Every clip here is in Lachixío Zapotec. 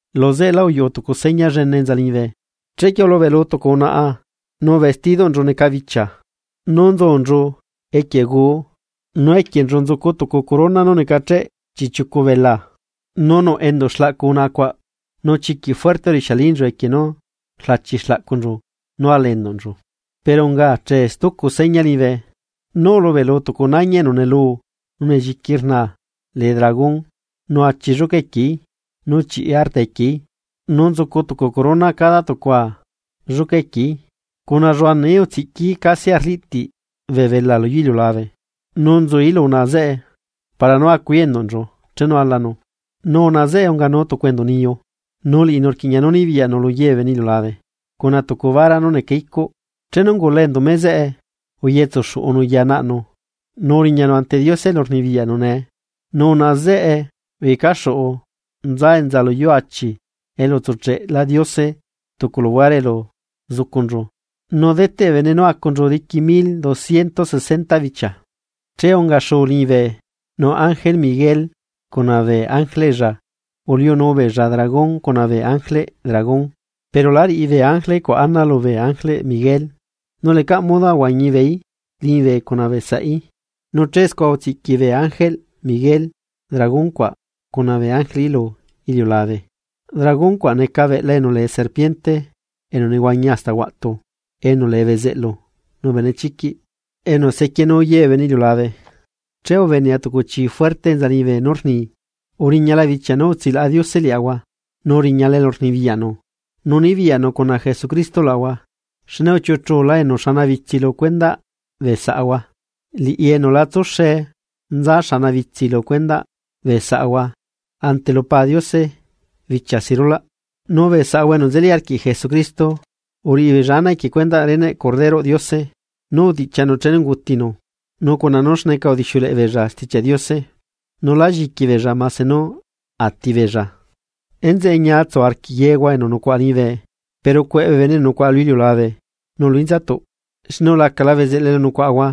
Luzeꞌela uyuꞌu tucu seña llene enza liñibe. Chequie ulubeꞌlu tucu unaꞌa nu vestidoꞌnchu neca bichia nu nzucunchu equie guu, nu equienchu nzucu tucu corona nú necacheꞌ chiꞌchiucu belaa. Nu nuꞌ enduꞌ xlaꞌcu unaꞌa cuaꞌ nu chiquiꞌ fuerte rixialinchu equie nú rlachi xlaꞌcunchu nú ala enduꞌnchu. Pero unga achee stucu seña liñibe. Nu ulubeꞌlu tucu nañi enu neluu nu nelliqui rnaa lee dragón nu achi lluca quieí, nu chiꞌi arta equieí nu nzucu tucu corona cada tucua lluca equieí. Cuna lluanaꞌí utsiꞌquií casi arliꞌtiꞌ bee belaa lu yuu iliulabe. Nu nzuí lu unaꞌa zeꞌe para nú acuí enduꞌnchu chenu alanu. Nu unaꞌa zeꞌe unganu tucu enduꞌ niyu, nu liꞌinu rquiꞌña nú nibiyaꞌnu luye bee bene iliulabe, cuna tucu vara nú neca icuꞌ. Nu chenu ungula enduꞌ meꞌ zeꞌe uyetsu xuꞌunu ya naꞌnu, nu uriñanu ante Diose elu nzucu Diose rnibiyaꞌ. Nu unaꞌa zeꞌe uyecaxuꞌu nza enza lu yuu achi elu utsucheꞌ Diose tucu luhuare elu zucunchu nu deteꞌ bee bene nú acunchu diqui mil dociento sesenta bichia. Che unga xuu liñibe, nu arcángel Miguel cuna bee ángeleꞌlla uliunu beella dragón cuna bee ángeleꞌ dragón. Pero lá riꞌi bee ángele cuaꞌ ana lubee arcángel Miguel, nu lecaꞌ modo ahuañi beeí liñibe cuna beesaꞌí. Nu che scua utsiꞌqui bee ángelꞌ Miguel dragón cuna bee ángeleꞌí lu iliulabe. Dragón cuaꞌ neca beꞌla enu lee serpiente enu nehuañi hasta huaꞌtu enu lee bezeꞌlu nu benechiquiꞌ, enu sequienu ye bee bene iliulabe. Che ubenea tucu chi fuerte enza liñibe nú rni: ―Uriñala bichia nú utsilaꞌa Diose liaꞌahua, nu uriñala elurnibiyaꞌnu, nu nibiyaꞌnu cuna Jesucristo luaꞌahua xne uchiuꞌuchula enu xanabitsi lu cuendaꞌ bee saꞌahua, liꞌi enu la tsuxe nza xanabitsi lu cuendaꞌ bee saꞌahua ante lu Pa Diose bichia si rulaꞌ. Nu bee saꞌahua enu nzeli arquiꞌ Jesucristo uriꞌi beella ana equie cuendaꞌ reneꞌ Corderoꞌ Diose nú utiꞌchianu chenu ungutinu, nu cuna nú xneca udixiuleꞌe beella Stichiaꞌ Diose, nu la lliqui beella mase nú atibeella. Enzeꞌe ñiatsu arquiꞌ yehua, enu nucuaꞌa liñibe, pero ¡cueꞌ bee bene enu nucuaꞌa lu iliulabe nu lu inzatuꞌ! Xne ulacala bezeꞌlu elu nucuaꞌahua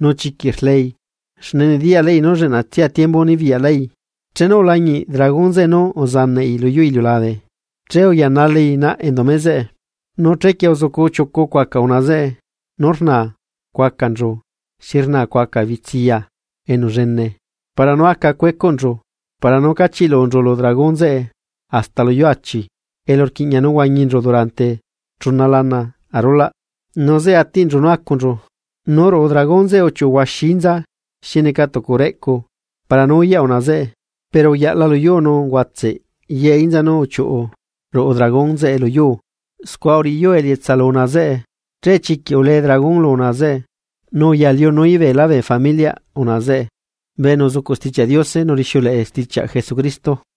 nu chiquiꞌ rlei, xne nediyaꞌlaꞌi nú lleꞌnatsia tiembu nebiyaꞌlai. Chenu ulañiꞌ dragón zeꞌe nú uzanaꞌí luyuu iliulabe, chequie uyanalaí naꞌ endumeꞌ zeꞌe. Nu chequie uzucu chiucu cuaca unaꞌa zeꞌe nu rnaa cuacanchu xi rnaa cuaca bitsiya enu llene, para nú aca cuecuꞌnchu para nú cachiꞌlunchu lu dragón zeꞌe hasta luyuu achi, elu rquiꞌña nú huañinchu durante chuna lana arulaꞌ nu zeꞌe atiꞌnchu nú acunchu. Nu ruꞌu dragón zeꞌe uchiuꞌu huaxi inza xi neca tucu reꞌcu para nú uyaꞌ unaꞌa zeꞌe. Pero uyaꞌla luyuu nu uguatseꞌ ye inza nu uchiuꞌ ruꞌu dragón zeꞌe luyuu. Scua uriꞌi yuu elietsa lu unaꞌa zeꞌe. Che chiquiꞌ ulee dragón lu unaꞌa zeꞌe, nu uyaliunuí beelá bee familiaꞌ unaꞌa zeꞌe, bee enu sucuꞌ Stichiaꞌ Diose nu rixiuleꞌe stichiaꞌ Jesucristo.